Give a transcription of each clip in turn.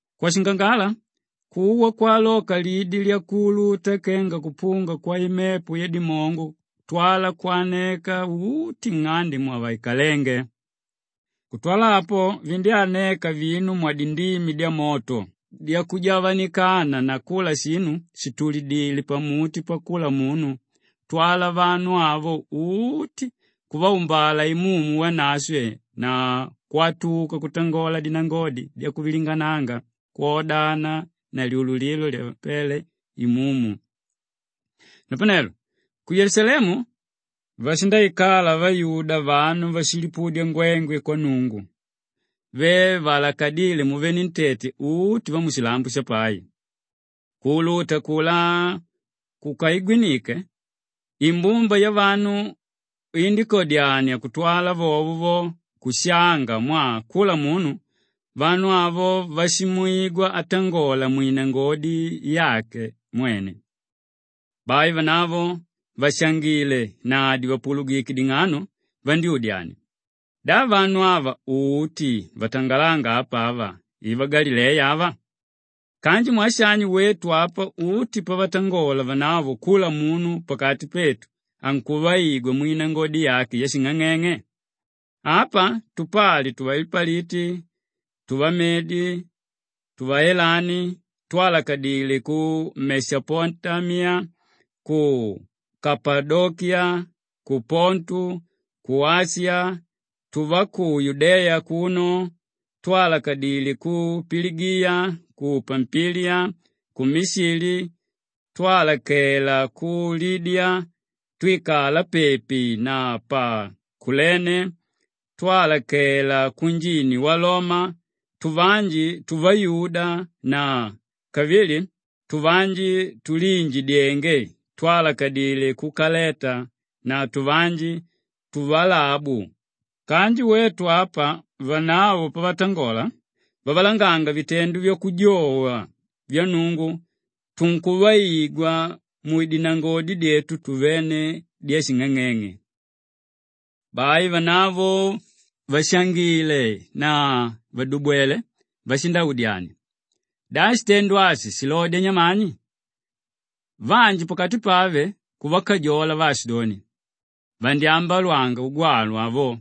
Kwashingangala, kuwa kwaloka lidi lyakuuluta kenga kupunga kwaimepo yadimongo kutwala kwanela uti nng'ande mwavaikalénge. Kutwala apo, vindyáneka vinu mwadindimi dyamoto dyakujavanikana na kula shinu shìtulidile pamuti pakula munu kutwala vanu avo uti kuvaumbala Imumu Wanashwe na kwatuka kutangola dinangodi dyakuvilingananga kwodana na lyululilo lyavapéle Imumu. Napanelo ku Yelusalemu vashindaikala vayuda vanu vakulipudya ngwengwe kwa Nnungu ve vaalakadíle muvenentete uti vamushilambo shapai. Kuuluta akulá kukaigwinike, imbumba yavanu indíkadyania kutwala vovo vo kushanga mwaa kula munu vanu avo ashivaigwa vatangola mwinangodi yake mwene. Bai vanavo vàshangile na dìvapulugike ding'ano vandyúdyania, “Da vanu ava uti vatangalánga apa ava i vagalileya ava? Kanji mwaa shani wetu apa uti pavatangola vanavo kula munu pakati petu ankuvaigwa mwinangodi yake yashing'ang'eng'e? Apa tupali tuvalipaliti, tuvamedi, tuvaelami, twálakadile ku Meshapotamiya, ku Kapadokiya, ku Pontu, ku Ashiya, tuva ku Yudeya akuno, twálakadile ku Piligiya, ku Pampiliya, ku Mishili, twálakela ku Libiya twíkala pepi na pa Kulene, twálakela kunjini wa Loma, tuvanji tuvayuda na kavili tuvanji túliinjidyenge, twálakadile ku Kaleta na tuvanji kwavaalabu; kanji wetu apa vanavo pavatangola vavalanga vitendo vyakujowa vya Nnungu tunkuvaigwa mudinangodi dyetu tuvene dyashing'ang'eng'e!” Bai vanavo vàshangile na vàdubwele vashindaudyania, “Da shitendo ashi shilodya nyamani?” Vanji pakati pave kuvakajola vaashidoni, “Vandyambalwanga ugwalwa avo.”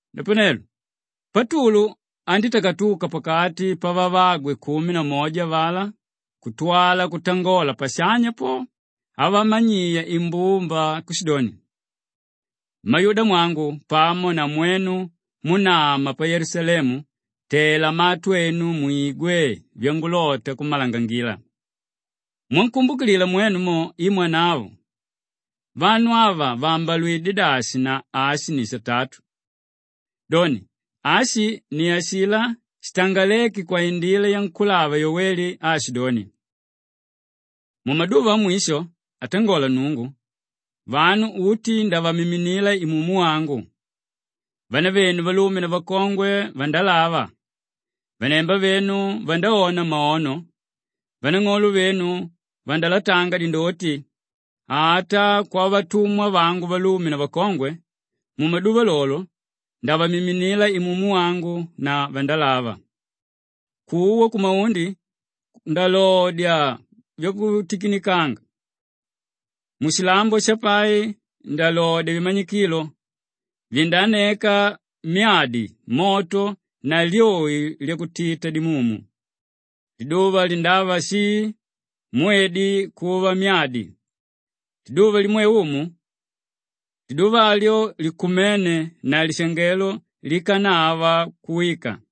Napanelo Patulu andítakatuka pakati pavavagwe kumi na moja avalá kutwala kutangola pashanya po, amanyiya imbumba kushidoni, “Mmayudeyamwangu pamo na mwenu múnama pa Yelusalemu, tela matu enu mwigwe vyangulota kummalangangila. Mwankumbukilila mwenu mo, i mwanavo. Vanu ava vaambalwidye dashi na ashi ni satatu! Doni, ashi ni ashilá shitangaléke kwaindila yankúlava Yoweli aashidoni, “ ‘Mumaduva amwisho, atangola Nnungu, vanu uti ndavamiminila Imumu wangu. Vanavenu valume na vakongwe vandalava, vanemba venu vandaona maono, vanang'olo venu vandalatanga dindoti. Ata kwavatumwa vangu valume na vakongwe, mumaduva lolo lo, ndavamiminila Imumu wangu na vandalava. Kuwa kumaundi ndalodya vyakutikinikanga, mushilambo shapai ndalodya vimanyikilo, vindaaneka myadi, moto na lyoi lyakutita dimumu. Liduva lindava shii, mwedi kuva myadi, liduva limwe Umu, liduva lyo likumene na lyalishangelo, likanava kuwika.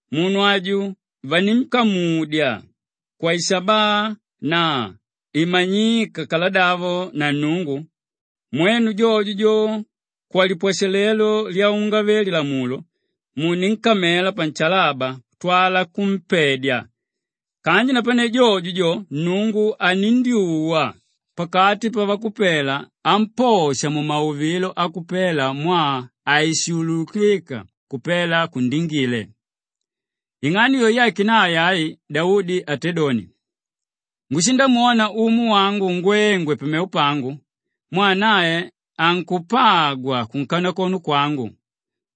munu aju vaninkamudya kwaishabaa na imanyika kaladavo na Nnungu, mwenu jojo jo, kwalipwashalelo lyavaungave-lilamulo muninkamela panshalaba kutwala kumpedya. Kanji napane jojo jo, Nnungu anindyuwa pakati pavakupela amposha mumauvilo akupela mwaa haishuulukika kupela kundingile. Ing'ano yo yake nae ai Daudi atédoni, “ ‘Ngushindamwona Umu wangu ngwengwe pamevo pangu mwaa nae ankupagwa kunkanakono kwangu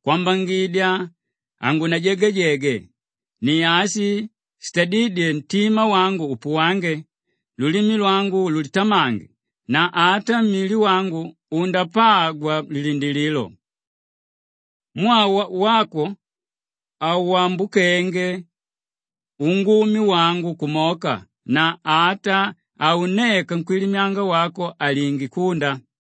kwambangidya hangunajagajege. Ni ashi shitadídye ntima wangu upuwange, lulimi lwangu lulitamange na ata mili wangu undapagwa mulilindilililo. Mwaa wako hawambukanga ungumi wangu kumoka na ata haunneka Nkwílimyanga wako alinge kunda.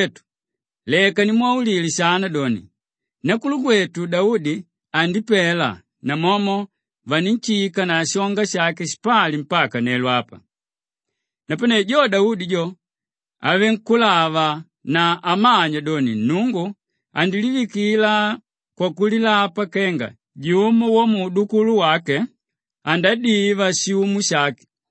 “Mmakwetu leka nimwaulile shana doni, nakulugwetu Daudi andipela namomo vaninshika na shonga shake shipali mpaka nelo apa. Napane jo Daudi jo, avele nkúlava na amanya doni Nnungu andilivikila kwakulilapa kenga jumo wamuudukulu wake andadiva pashiumu shake,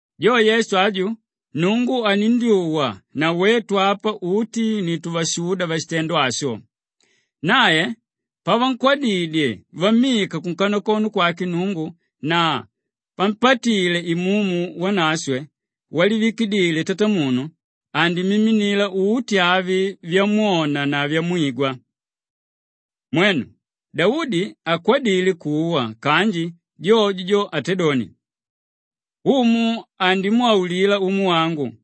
Jo Yesu aju, Nnungu anindyuwa na wetu apa uti ni tuvashuda vashitendo asho. Nae pavankwadidye vammika kunkanakono kwake Nnungu na pampatile Imumu Wanashwe walivikidile Tatamunu, andimiminila uti avi vyamwona na vyamwigwa. Mwenu, Daudi hakwadile kuwa kanji jojo jo atédoni, “ ‘Umu andimwaulila Umu wangu,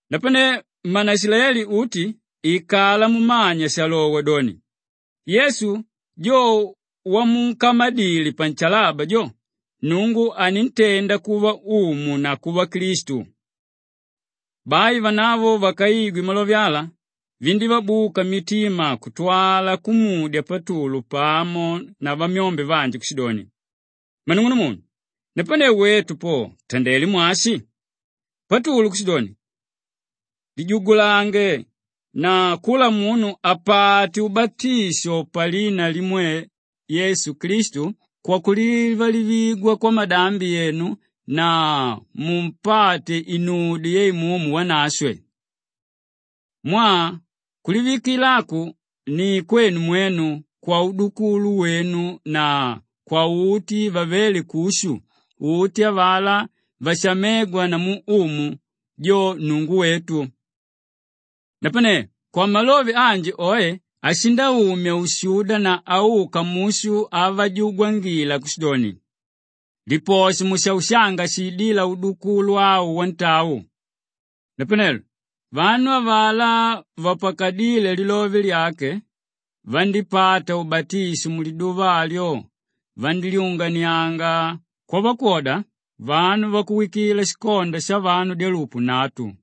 Napanelo mmaishilaeli uti ikala mumanya shalowa doni, Yesu jo, jo wamunkamadile panshalaba jo, Nnungu anintenda kuva Umu na kuva Klistu.” Bai vanavo vakaigwe malove ala, vindívabuka mitima kutwala kumudya Patulu pamo na vamyombe vanji kushidoni, “Mmanung'unumunu, napanelo wetu po tutandelé mwashi?” Patulu kushidoni, “Lijugulange na kula munu apate ubatisho palina limwe Yesu Klistu kwakulivalivigwa kwamadambi enu na mundapata inudyo ya Imumu Wanashwe. Mwaa kulivikila aku ni kwenu mwenu, kwaudukulu wenu na kwauti vavelé kushu; uti avalá vashamégwa namu Umu, jo Nnungu wetu.” Napane kwamalove anji oe ashindaumya ushuda na auka mushu avajugwangila kushidoni, “Liposhe mushaushanga shiidíla udukulu au wantau.” Napanelo vanu avalá vapakadíle lilove lyake vandípata ubatisho; muliduva alyo vandílyunganianga kwavakwoda vanu vakuwikila shikonda shavanu dyalupu nnatu.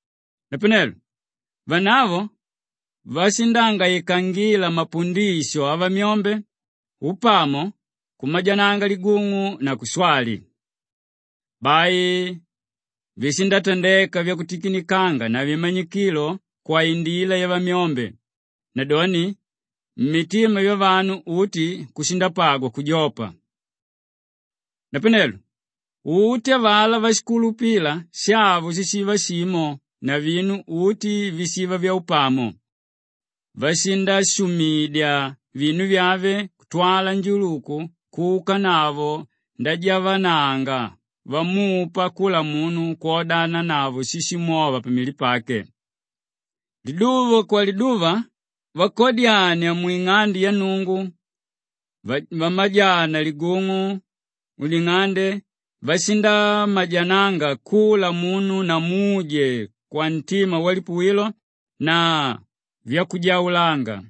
Napanelo vanavo vashindangaikangila mapundisho avamyombe, upamo, kumajananga ligung'u na kushwali. Bai vishindatandeka vyakutikinikanga na vimanyikilo kwaindila yavamyombe, nadoni mmitima vyavanu uti mushindapagwa kujopa. Napanelo uti avalá váshikulupila shavo shishiva shimo na vinu uti vishiva vyaupamo; vashindashumidya vinu vyave kutwala njuluku kuukanavo ndajavananga vamupa kula munu kwodananavo víshimwova pamili pake. Liduva kwaliduva vakadyania mwing'ande ya Nnungu, vamajananga ligung'u muding'ande, vashindamajananga kula munu na muje kwamitima vyalipuwilo na vyakujaulanga,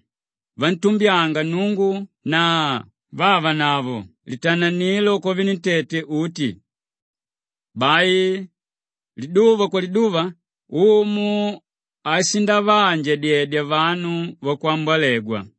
vantumbyanga Nnungu na vavanavo litananilo kwavenentete uti. Bai liduva kwaliduva Umu ashindavaanjadyedya vanu vakwambolegwa.